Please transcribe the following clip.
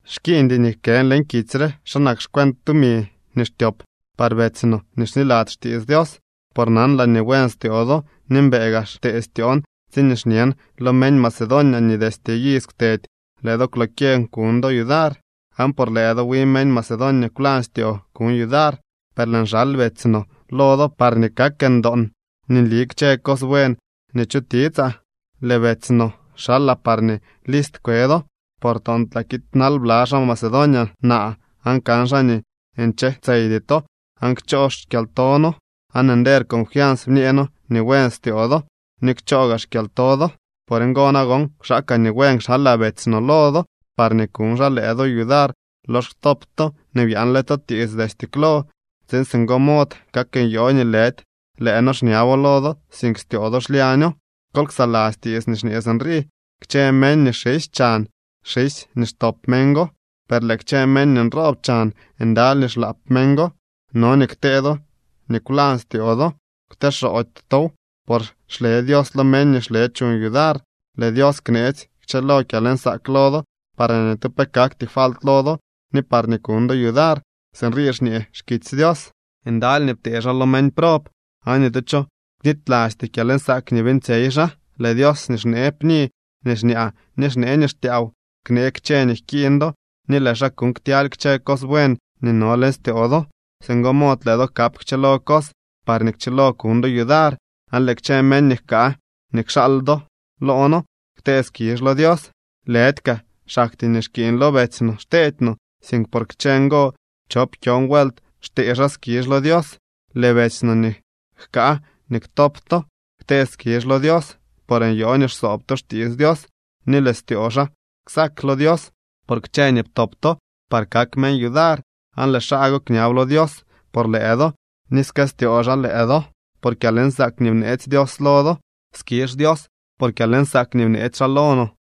Xkiiñdy nii jkën leñ kitsy re xa nak xcuent tumi nii xtyop par betsy no nii xniladzy xtiits Dios. Por nanlaa nii buen styoo do, ni mbëë gaa xtee styoon tsiñee xñen lo meñ Macedonia nii destye iz kwtedy lëë do kwlokyeñ kuñ do yudar, aan por lëë do wi meñ Macedonia kwlañ styoo kuñ yudar. Per lëën xal betsy no lo do parñee kak ndoon nii nli kchë cos buen nii chutiitsaa. Lëë betsy no xalaa parñee list kwe do, por toontlaa kiidnal bla xaa Macedonia naa aan kan xaa nii nche tseydy to aan kchoo xkyalto noo, aan nder confians bñee noo nii buen styoo do ni kchoo gaa xkyalto do. Por ngo nagon kwxaakaa nii buen kxalaa betsy no lo do parñee kuñ xaa lëë do yudar lox ktop to nii byaanle to tiits destye klo, tsiin singo mod kak nyoo nii lëdy lëë noo xñabo lo do, sink styoo do xlyaño. Kol ksaladzy tiits nii xñee sinrii: Kchë meñ nii xisy chan, xisy nii xtop meñ go, per lëë kchë meñ nii nroob chan, ndaly nii xlaap meñ go. No nii ktee do nii kwlañ styoo do. Kwteexoody tow, por xle Dios lo meñ nii xle chuñ yudar. Lëë Dios kneetsy kchëlo kyalnsaak lo do, parñee ni tu pe kakty falt lo do ni parñee kuñ do yudar. Sinrii xñee xkitsy Dios: Ndaly nii ptee xaa lo meñ prob, aan ni tu cho knitylasty kyalnsaak nii beeñtsyey xaa. Lëë Dios nii xnee pni nii xñaa ni xnee nii xtyaaw, knee kchë nii jkiiñ do ni lëë xaa kuuñ ktyaly kchë cos buen nii no leñ styoo do. Singo mod lëë do kap kchëlo cos parñee kchilo kuñ do yudar. Aan lëë kchë meñ nii jkaa nii kxaal do loo noo ktee skizh lo Dios. Lëdy kaa xaktyee nii xkiiñ lo betsy no xteedy to, sink por kchë ngo chop kyon vuelt xtee xaa skizh lo Dios. Lëë betsy no nii jkaa nii ktop to ktee skizh lo Dios, por nyoo nii xsoob to xtiits Dios. Ni lëë styoo xaa ksak lo Dios por kchë nii ptop to par kak meñ yudar. Aan lëë xaa go kñab lo Dios por lëë do ni skëstyoo xaa lëë do por kyalnsaak nii bneetsy Dios lo do. ¡Skizh Dios por kyalnsaak nii bneetsy xaa lo no!